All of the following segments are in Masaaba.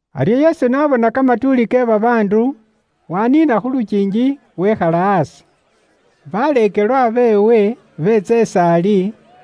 Aryo Yesu n'abona kamatuuli ke babaandu, waaniina khu lukiingi, wekhala aasi. Baleekelwa beewe beetsa is'aali,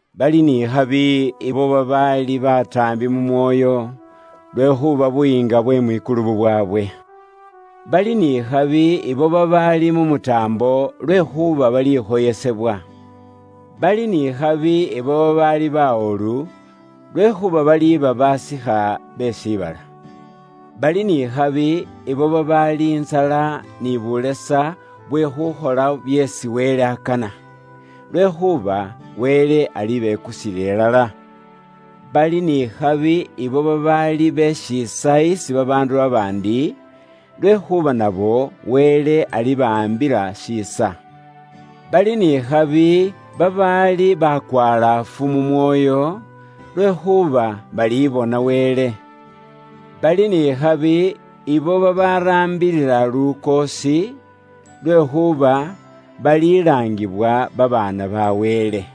“Bali n'ikhabi ibo babaali bataambi mu mwoyo, lwekhuuba Buyiinga bwe mwikulu bubwaabwe. “Bali n'ikhabi ibo babaali mu mutaambo, lwekhuuba balikhoyesebwa. “Bali n'ikhabi ibo babaali bawolu, lwekhuuba baliiba basikha be shiibala. “Bali n'ikhabi ibo babaali intsala ni bulesa bwe khuukhola byeesi Wele akana, lwekhuuba Wele alibekusila ilala. “Bali n'ikhabi ibo babaali be shiisa isi babaandu babaandi, lwekhuuba nabo Wele alibawaambila shiisa. “Bali n'ikhabi babaali bakwalaafu mu mwoyo, lwekhuuba balibona Wele. “Bali n'ikhabi ibo babaraambilila lukoosi, lwekhuuba balilaangibwa babaana ba Wele.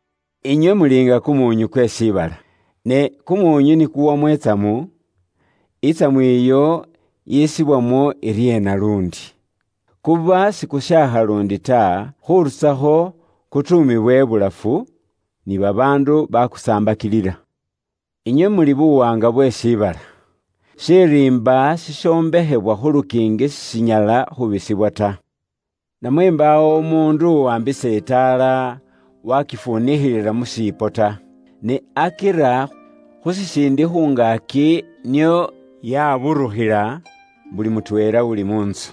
“Inywe muli nga kumuunyu kwe shiibala. Ne kumuunyu ni kuwamo itsamu, itsamu iyo yisibwamo iryeena luundi? Kuba sikushaakha luundi ta, khurusakho kutuumibwa ibulafu, ni babaandu bakusaambakilila. “Inywe muli buwaanga bwe shiibala. Shiriimba shishombekhebwa khu lukiingi sishinyala khuubisibwa ta. Namwe mbaawo umuundu uwaambisa itaala, waakifunikhilila mu shiipo ta, ne akira khu shisiindi khu ngaaki nio yaaburukhila buli mutweela uli mu ntsu.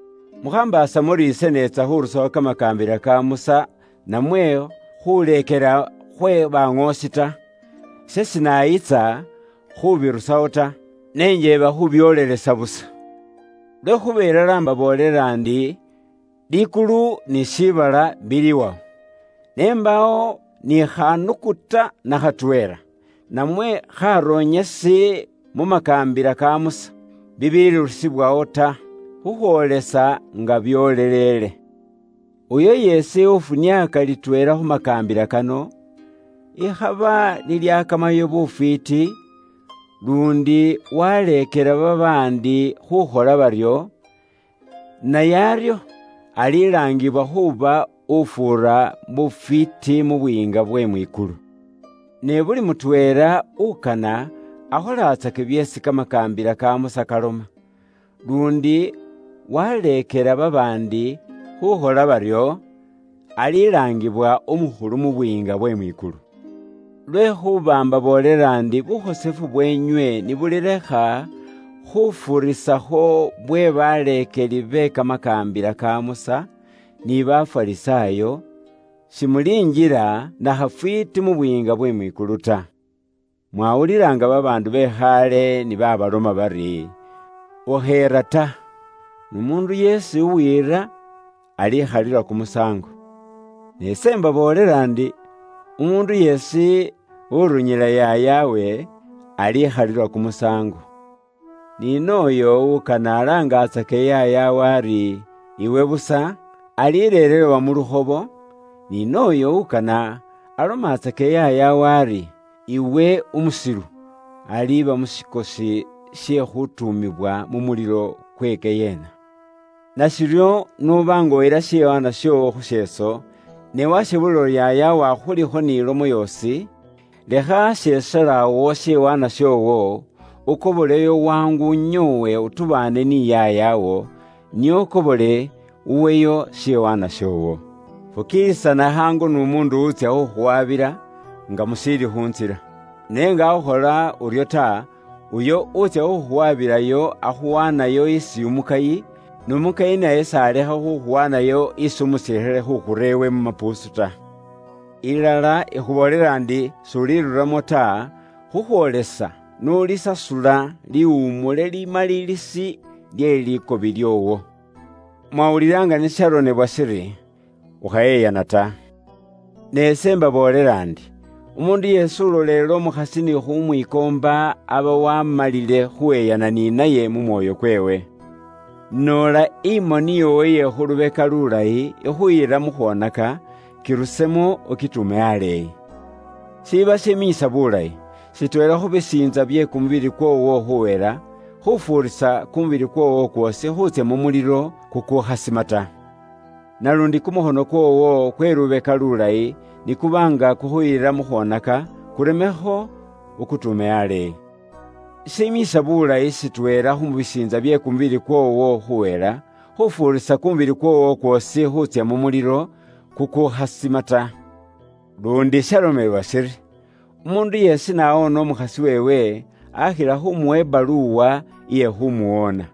“Mukhambaasa muri ise neetsa khurusawo kamakaambila ka Musa namwe khuuleekela khwe baŋoosi ta. Ise sinayitsa khuubirusawo ta, ne njeeba khuubyoolelesa busa. Lwekhuuba ilala imbaboolela ndi, likulu ni shiibala biliwawo, ne mbaawo ni khanukuta na khatweela, namwe kharonyesi mu makaambila ka Musa, bibiilirusibwawo ta, khukhwoolesa nga byoosi byoolelele. Uyo yeesi ufuniaaka litweela khu makaambila kano, ikhaba lilyakamayo bufwiiti, luundi waleekela babaandi khuukhola baryo, naye aryo alilaangibwa khuuba ufuura bufwiiti mu Buyiinga bwe mwikulu. Ne buli mutweela ukana akholatsake byeesi kamakaambila ka Musa kaloma, luundi waaleekela babaandi khuukhola baryo, alilaangibwa umukhulu mu Buyiinga bwe mwikulu. Lwekhuuba imbaboolela ndi bukhosefu bweenywe ni bulilekha khufuurisakho bwe baleekeli be kamakaambila ka Musa, ni Bafarisaayo, simulinjila na khafwiiti mu Buyiinga bwe mwikulu ta. “Inywe mwaawulila nga babaandu be khaale ni baabaloma bari, ‘Ukheera ta, n'umuundu yeesi uwiira alikhalilwa kumusaango.’ Ne ise imbaboolela ndi, umuundu yeesi urunyila yaayawe, alikhalilwa kumusaango, ni nooyo ukana alaangatsake yaayawe ari, ‘Iwe s'ulimo kamakesi ta,’ alireerewa mu lukhobo, ni nooyo ukana alomatsake yaayawe ari, ‘Iwe umusilu,’ aliiba mu shikosi she khutuumibwa mu mulilo kukukhasima ta. “Nashiryo, n'uba nga uyila shiwaanwa shoowo khu sheeso, ne washebulila uri yaayawo akhulikho ni lomo yoosi, lekha asheeselo awo shiwaanwa shoowo, ukoboleyo khaangu unyoowe utubaane ni yaayawo, nio ukobole uweyo shiwaanwa shoowo. “Fukiilisana khaangu n'umuundu utsya khukhuwaabila, nga mushiili khu ntsila. Ne nga akhukhola uryo ta, uyo uutsya khukhuwaabilayo, akhuwaanayo isi umukayi, n'umukayi naye kane akhuwaaneyo iwe isi umusilikhale, khuukhura iwe mu mapuusu. Ilala ikhuboolela ndi, s'uliruramo ta, khukhwoolesa n'ulisasula liwumule limalilisi lye likobi lyoowo. “Inywe mwaawulila nga ni shalomebwa shiri, ‘Ukhayeyana ta.’ Ne ise imbaboolela ndi, umuundu yeesi ulolela umukhasi ni khumwiikoomba aba waamalile khuuyeyana ni naye mu mwoyo kweewe. Noola imoni yoowo iye khu lubeka lulayi ikhuyila mu khwoneka, kirusemo, ukituume aleeyi. Shiba shiminyisa buulayi, shitweela khu bisiintsa bye kumubili kwoowo khuuhela, khufuurisa kumubili kwoowo kwoosi khuutsya mu mulilo kukuukhasima ta. Naluundi kumukhono kwoowo kwe khu lubeka lulayi ni kuba nga kukhuyila mu khwoneka, kuremekho ukutuume aleeyi. Shiminyisa bulayi shitweela khu bisiintsa bye kumubili kwoowo khuhela, khufuurisa kumubili kwoowo kwoosi khuutsya mu mulilo kukukhasima ta. “Luundi shalomewa shiri, ‘Umuundu yeesi n'aaloba umukhasi weewe, akhila khuumuwa ibaluwa iye khuumuloba.’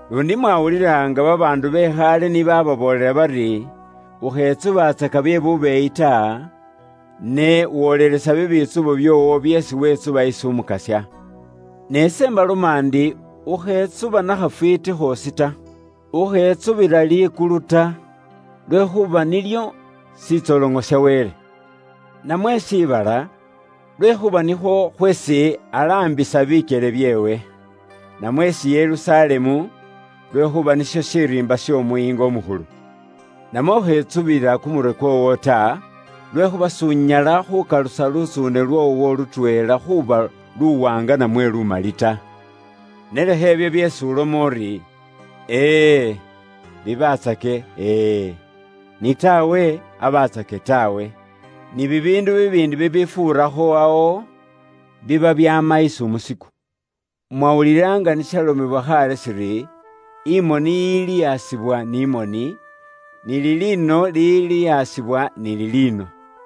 “Luundi mwawulila nga babaandu be khaale ni baababoolela bari, ‘Ukhetsubatsaka bye bubeeyi ta, ne wolelesa bibitsubo byoowo byeesi wetsuba isi Umukasya.’ Ne ise imbaloma ndi, ukhetsuba na khafwiiti khoosi ta. Ukhetsubila likulu ta, lwekhuuba nilyo shitsoloŋo sha Wele; namwe shiibala, lwekhuuba nikhwo khweesi alaambisa bikyele byeewe; namwe isi Yerusalemu, lwekhuuba nisho shiriimba sh'Omuyiinga umukhulu. Namwe ukhetsubila kumurwe kwoowo ta, lwekhuuba s'unyala khukalusa lutsuune lwoowo lutweela khuuba luwaanga namwe lumali ta. Ne lekha ibyo byeesi uloma uri, ‘E e,’ bibatsake ‘E e,’ ni ‘Taawe,’ abatsake ‘Taawe’. Ni bibiindu bibiindi bibifuurakho awo, biba byaama isi umusiku. “Mwawulila nga ni shalomewa khaale shiri, ‘Imoni iliyasibwa ni moni, ni liliino liliyasibwa ni liliino.’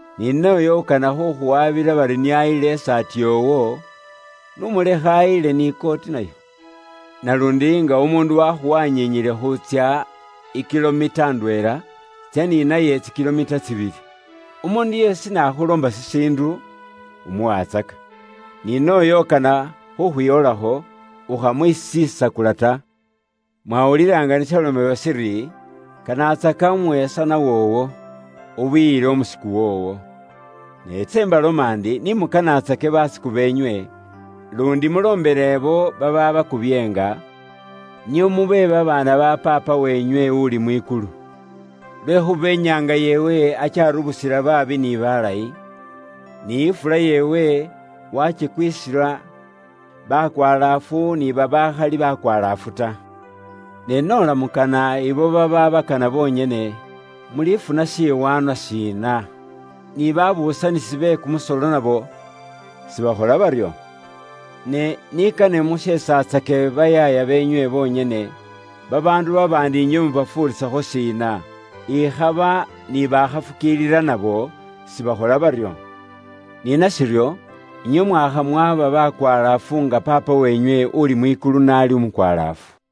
Ni nooyo ukana khukhuwabila bari nio ayile isaati yoowo, n'umulekhe ayile ni kooti nayo. Naluundi nga umuundu waakhuwanyinyile khuutsya i kilomita ndweela, tsya ni naye tsi kilomita tsibili. Umuundu yeesi n'akhuloomba shishiindu, umuwatsaka, ni nooyo ukana khukhwiwolakho, ukhamwisisakula ta. “Inywe mwaawulila nga ni shalomewa shiri, ‘Kanatsaka umwesanwa woowo, ubiyile umusiku woowo.’ Ne ise imbaloma ndi, ni mukanaatsake basiku beenywe, luundi muloombele ibo babaabakubyeenga, nio mube babaana ba Paapa weenywe uli mwikulu. Lwekhuuba inyaanga yeewe akyaburusila babaakhali babeyikinwa ta ni babeyikinwa, ni ifula yeewe yakhupila babaakhola biilayi ni babaakhakhola biilayi ta. Ne noola mukana abo babaabakana bonyene, mulifuna shiwaanwa shiina? Ni baabuusanisi be kumusolo nabo sibakhola baryo? Ne ni kane musheesatsake bayaaya beenywe bonyene, babaandu babaandi inywe mubafuurisakho shiina? Ikhaba ni bakhafukiilila nabo sibakhola baryo? Ni nashiryo, inywe mwaakha mwaba bakwalaafu nga Paapa weenywe uli mwikulu n'ali umukwalaafu.